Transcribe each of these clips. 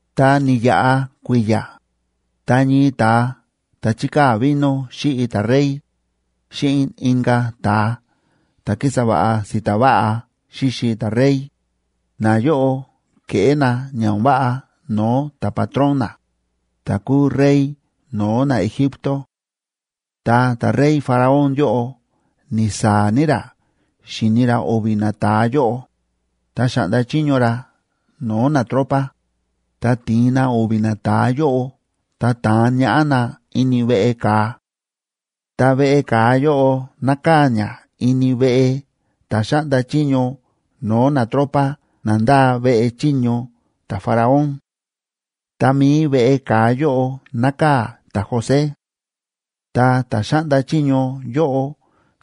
Ta ni̱yaꞌa kui̱ya̱, ta ñii ta̱a ta̱ chíkaa̱ vino xíꞌi ta̱rey, xíꞌin inka̱ ta̱a ta̱ kísa va̱ꞌa si̱ta̱ va̱ꞌa xíxi ta̱rey, nayóꞌo ke̱ꞌé na ña o̱n váꞌa no̱o̱ ta̱patrón na, ta̱ kúu rey no̱o̱ naEgipto. Ta ta̱rey Faraón yóꞌo ni̱saa̱ ní ra xi̱ni ra o̱vi̱ nata̱a yóꞌo, ta xa̱ꞌnda chiño ra no̱o̱ natropa, ta ti̱in na o̱vi̱ nata̱a yóꞌo ta ta̱an ñaꞌá na ini veꞌe ka̱a. Ta veꞌe ka̱a yóꞌo nákaa̱ ña ini veꞌe ta̱ xáꞌnda chiño no̱o̱ natropa na ndáa veꞌe chiño ta̱Faraón. Ta mi̱i veꞌe ka̱a yóꞌo nákaa̱ ta̱José. Ta ta̱ xáꞌnda chiño yóꞌo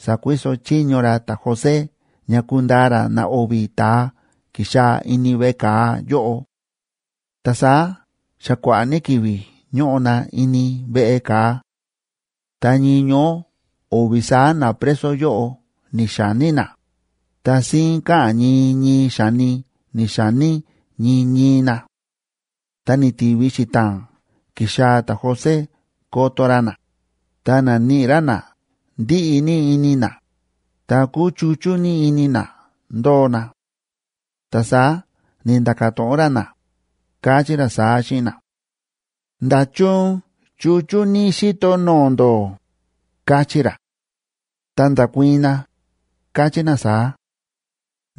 sa̱kuiso chiño ra ta̱José ña kundaa ra na o̱vi̱ ta̱a ki̱xaa̱ ini veꞌe ka̱a yóꞌo. Ta saá xa kua̱ꞌa̱ ní ki̱vi̱ ñóꞌo na ini veꞌe ka̱a. Ta ñii ñoó o̱vi̱ saá napreso yóꞌo ni̱xa̱ní na, ta síín káꞌa̱n ñii ñii xa̱ni ni̱xa̱ní ñii ñii na. Ta ni̱ti̱vi xita̱a̱n ki̱xaa̱ ta̱José koto ra na, ta na̱níꞌi ra na ndíꞌi ní ini na, ta kúchuchú ní ini na ndóo na; ta saá ni̱nda̱ka̱ to̱ꞌon ra na, káchí ra saá xíꞌin na: ―¿Nda̱chun chúchú ní xíto no̱o̱ ndó? ―káchí ra. Ta nda̱kuii̱n na, káchí na saá: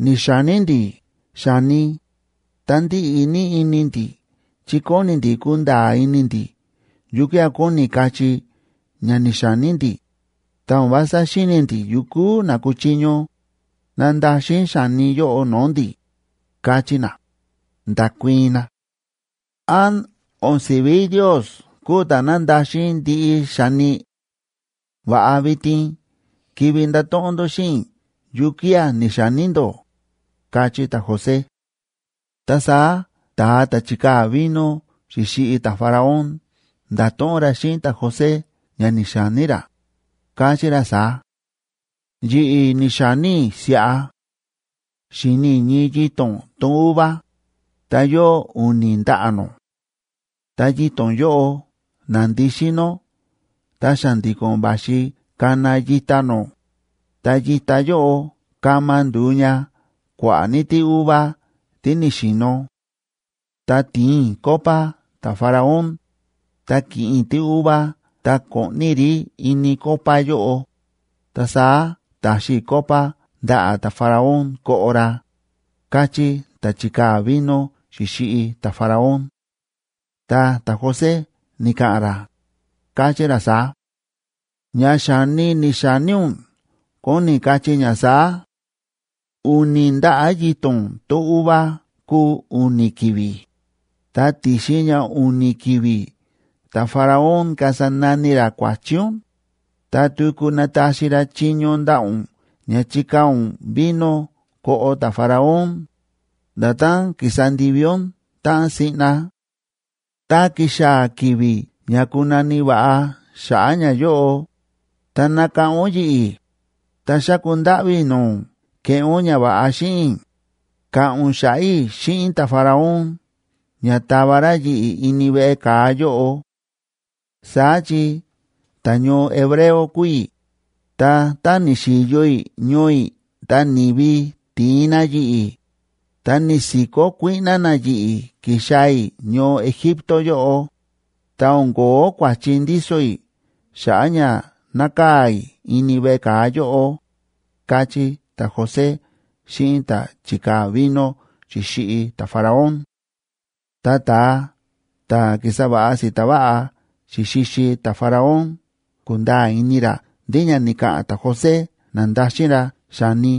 ―Ni̱xa̱ní ndi̱ xa̱ni, ta ndíꞌi ní ini ndi̱ chi kóni ndi̱ kunda̱a̱ ini ndi̱ yukía̱ kóni kachí ña ni̱xa̱ní ndi̱, ta o̱n vása xíni̱ ndi̱ yukú na kuchiño nandaxin xa̱ni yóꞌo no̱o̱ ndi̱ ―káchí na, nda̱kuii̱n na. ―¿Án o̱n si̱ví Ndios kúu ta̱ nándaxin ndiꞌi xa̱ni? Va̱ꞌa vitin kivi ndato̱ꞌon ndó xíꞌin i̱ yukía̱ ni̱xa̱ní ndó ―káchí ta̱José. Ta saá ta̱a ta̱ chi̱kaa̱ vino xi̱xiꞌi ta̱Faraón nda̱to̱ꞌon ra xíꞌin ta̱José ña ni̱xa̱ní ra, káchí ra saá: ―Yi̱ꞌi̱ ni̱xa̱ní i̱ siꞌa: xi̱ni i̱ ñii yito̱n tón uva, ta yóo u̱ni̱ ndaꞌa̱ nó. Ta yito̱n yóꞌo na̱ndisín nó ta xa̱ndi̱ko̱n va̱xi kana yita nó, ta yita yóꞌo kama ndu̱u ña kua̱ꞌa̱ ní tíuva tí ni̱xi̱no̱. Ta ti̱in i̱ copa ta̱Faraón, ta ki̱ꞌin i̱ tíuva ta ko̱ꞌni i̱ rí ini copa yóꞌo, ta saá ta̱xi i̱ copa ndaꞌa̱ ta̱Faraón koꞌo ra ―káchí ta̱ chi̱kaa̱ vino xi̱xiꞌi ta̱Faraón. Ta ta̱José ni̱ka̱ꞌa̱n ra, káchí ra saá: ―Ña xa̱ni ni̱xa̱ní ún kóni kachí ña saá: u̱ni̱ ndaꞌa̱ yito̱n tón uva kúu u̱ni̱ ki̱vi̱, ta ti̱xin ña u̱ni̱ ki̱vi̱ ta̱Faraón kasa nani ra kua̱chi ún, ta tuku nataxi ra chiño ndaꞌa̱ ún ña chikaa̱ ún vino koꞌo ta̱Faraón, nda̱tán ki̱sa ndivi ún táꞌan siꞌna. Tá kixaa̱ ki̱vi̱ ña ku̱na̱ni̱ va̱ꞌa xa̱ꞌa̱ ñayóꞌo, ta nakáꞌán ún yi̱ꞌi̱, ta xáku ndáꞌví i̱ no̱o̱ ún keꞌé ún ñava̱ꞌa xíꞌin i̱, ka̱ꞌa̱n ún xa̱ꞌa̱ i̱ xíꞌin ta̱Faraón ña tava ra yi̱ꞌi̱ ini veꞌe ka̱a yóꞌo. Saá chi ta̱ñoo hebreo kúu i̱, ta tá ni̱xi̱yo i̱ ñoo i̱ ta ni̱vi ti̱in na yi̱ꞌi̱, ta ni̱si̱kó kuíꞌná na yi̱ꞌi̱ ki̱xaa̱ i̱ ñoo Egipto yóꞌo, ta o̱n ko̱ó kua̱chi ndíso i̱ xa̱ꞌa̱ ña nákaa̱ i̱ ini veꞌe ka̱a yóꞌo ―káchí ta̱José xíꞌin ta̱ chi̱kaa̱ vino xi̱xiꞌi ta̱Faraón. Tá ta̱a ta̱ ki̱sa va̱ꞌa si̱ta̱ va̱ꞌa xi̱xixi ta̱Faraón ku̱nda̱a̱ ini ra ndí ña ni̱ka̱ꞌa̱n ta̱José na̱ndaxin ra xa̱ni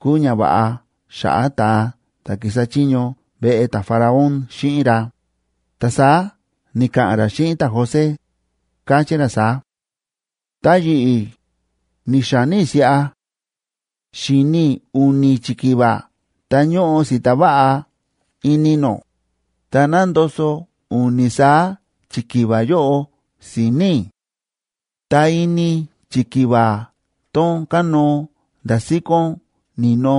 kúu ñava̱ꞌa xa̱ꞌa̱ ta̱a ta̱ ki̱sa chiño veꞌe ta̱Faraón xíꞌin ra, ta saá ni̱ka̱ꞌa̱n ra xíꞌin ta̱José, káchí ra saá: ―Ta yi̱ꞌi̱, ni̱xa̱ní i̱ siꞌa: xi̱ni i̱ u̱ni̱ chikiva ta ñóꞌo si̱ta̱ va̱ꞌa ini nó, ta nándoso̱ u̱ni̱ saá chikiva yóꞌo si̱ni̱ i̱. Ta ini chikiva tón kánóo nda̱ síkón ni̱no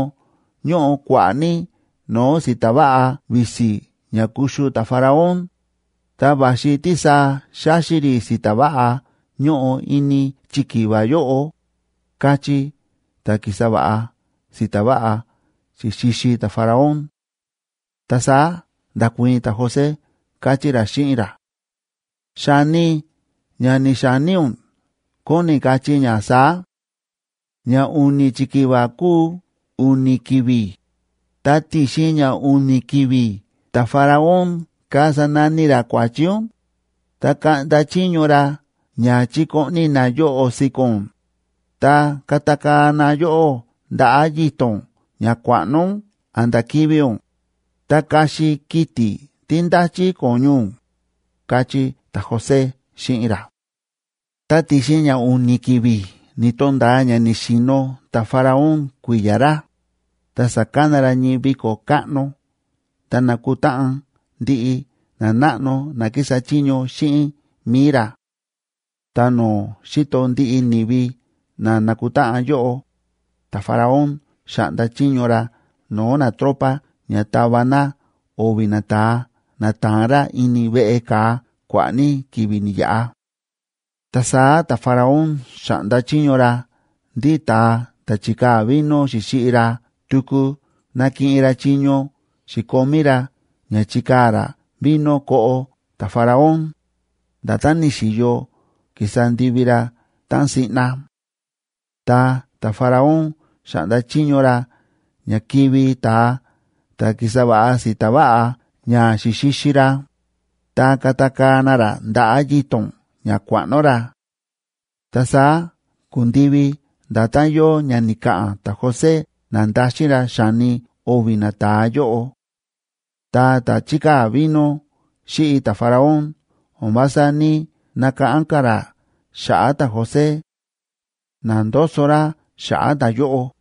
ñóꞌo kua̱ꞌa̱ ní no̱o̱ si̱ta̱ va̱ꞌa visi ña kuxu ta̱Faraón, ta va̱xi tísaa xáxi rí si̱ta̱ va̱ꞌa ñóꞌo ini chikiva yóꞌo ―káchí ta̱ ki̱sa va̱ꞌa si̱ta̱ va̱ꞌa xi̱xixi ta̱Faraón. Ta saá nda̱kuii̱n ta̱José, káchí ra xíꞌin ra: ―Xa̱ni ña ni̱xa̱ní ún kóni kachí ña saá: ña u̱ni̱ chikiva kúu u̱ni̱ ki̱vi̱, ta ti̱xin ña u̱ni̱ ki̱vi̱ ta̱Faraón kasa nani ra kua̱chi ún, ta kaꞌnda chiño ra ña chikoꞌni na yoꞌo̱ si̱ko̱n ún, ta katakaa̱ na yóꞌó ndaꞌa̱ yito̱n ña kua̱ꞌno ún a̱nda̱ kivi̱ ún, ta kaxi kiti̱ tí ndáchí ko̱ñu ún ―káchí ta̱José xíꞌin ra. Ta ti̱xin ña u̱ni̱ ki̱vi̱ ni̱to̱nda̱a ña ni̱xi̱no̱ ta̱Faraón kui̱ya̱ ra, ta sa̱kana ra ñii viko̱ káꞌno ta na̱kutáꞌan ndiꞌi nanáꞌno na kísa chiño xíꞌin mi̱i ra. Ta no̱o̱ xíto ndiꞌi ni̱vi na na̱kutáꞌan yóꞌo, ta̱Faraón xa̱ꞌnda chiño ra no̱o̱ natropa ña ta̱va na o̱vi̱ nata̱a na ta̱an ra ini veꞌe ka̱a kua̱ꞌa̱ ní ki̱vi̱ ni̱yaꞌa. Ta saá ta̱Faraón xa̱ꞌnda chiño ra ndí ta̱a ta̱ chi̱kaa̱ vino xi̱xiꞌi ra tuku nakiꞌin ra chiño xi̱komí ra ña chikaa̱ ra vino koꞌo ta̱Faraón, nda̱tán ni̱xi̱yo ki̱sa ndivi ra táꞌan siꞌna; ta ta̱Faraón xa̱ꞌnda chiño ra ña kivi̱ ta̱a ta̱ ki̱sa va̱ꞌa si̱ta̱ va̱ꞌa ña xi̱xixi ra, ta katakaa̱ na ra ndaꞌa̱ yito̱n ña kua̱ꞌno ra. Ta saá ku̱ndivi nda̱tán yóo ña ni̱ka̱ꞌa̱n ta̱José na̱ndaxin ra xa̱ni o̱vi̱ nata̱a yóꞌo. Ta ta̱ chíkaa̱ vino xíꞌi ta̱Faraón o̱n vása ní‑nakáꞌán ka̱ ra xa̱ꞌa̱ ta̱José; na̱ndoso ra xa̱ꞌa̱ ta̱yóꞌo.